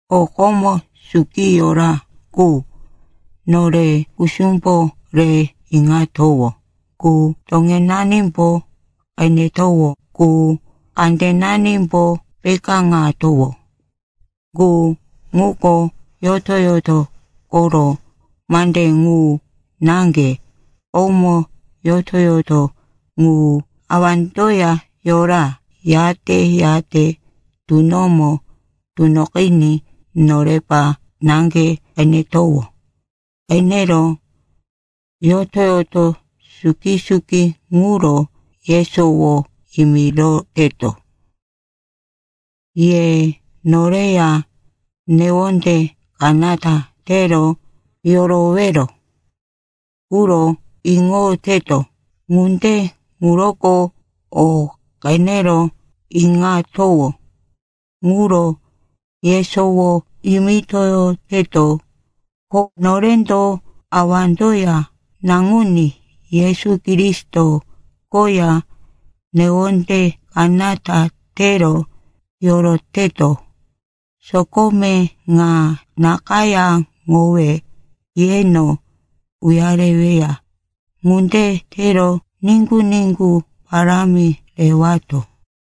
O komo suki yora qu, nore kusumbo re iŋatowó qu, toŋenanimbo qenetowó qu, kandenanimbo pekáŋatowó qu, ŋuko yoto-yoto koro mande ŋu naŋge. Komo yoto-yoto ŋu Awandoya yora. Yate-yate tunomo tunoqiní norepa naŋge qenetowó. Qenero yoto-yoto suki-suki ŋuro yesowo yimiroteto. Ye noreya newonde kanata tero yorowero quro iŋoyoteto. Ŋunde ŋuroko o qenero iŋatowó ŋuro yesowo yimitoyoteto. Ko norendo Awandoya Naŋuní Yesu Kristo koya newonde kanata tero yoroteto. Sokome ŋa nakayáŋowe yeno uyareweya. Ŋunde tero niŋgu-niŋgu parámi rewato.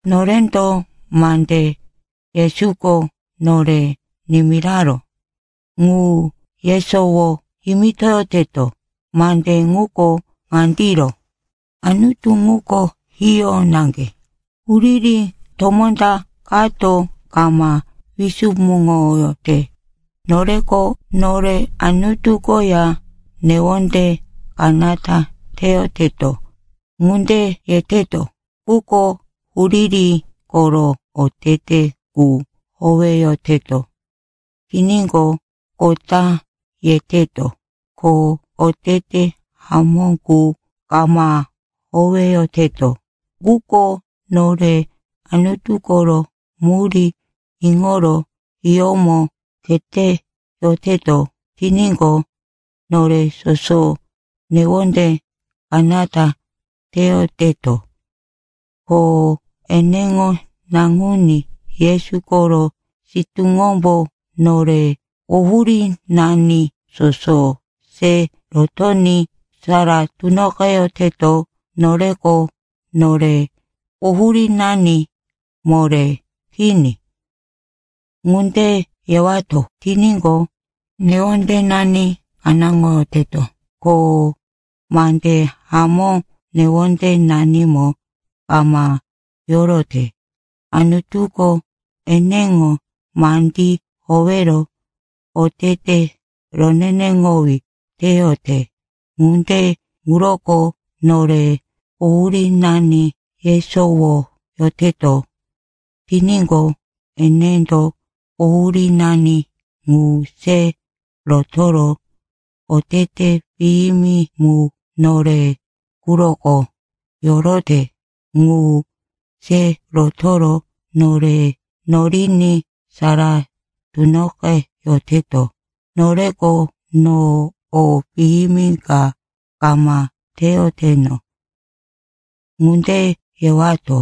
Norendo mande Yesuko nore nimiraró, ŋu yesowo yimitoyoteto. Mande ŋuko ŋandiro, Anutu ŋuko hiyó naŋge, huriri tomó ta kato kama wisumuŋoyote. Noreko, “Nore Anutu koya newonde kanata teyoteto,” ŋunde yeteto, quko huriri koro otete qu howeyoteto tiníqo, kota yeteto, ko otete hamó qu kama howeyoteto. Quko nore Anutu koro murí iŋoro hiyómo kheteyoteto tiníqo, nore soso newonde kanata teyoteto, ko eneŋo Naŋuní Yesu koro sitúŋombo nore quhurínani soso se rotoní sara tunoqeyoteto. Noreko, “Nore quhurínani moré kini,” ŋunde yewato tiníqo, newondenani kanáŋoyoteto, ko mande hamó newondenanimo kama yorote. Anutuko eneŋo mandí howero otete roneneŋowí teyote. Ŋunde ŋuroko nore quhurínani yesowoyoteto tiníqo, enendo quhurínani ŋu se rotoro, otete piyimi mu nore quroko yorote ŋu se rotoro, nore noriní sara tunoqeyoteto. Noreko, “No o piyimi ka kama teyoteno,” ŋunde yewato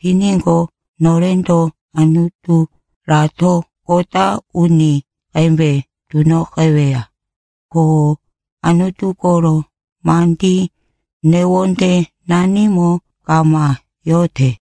tiníqo, norendo Anuturato kota uni qembe tunoqeweya. Ko Anutu koro mandí newondenanimo kama yote.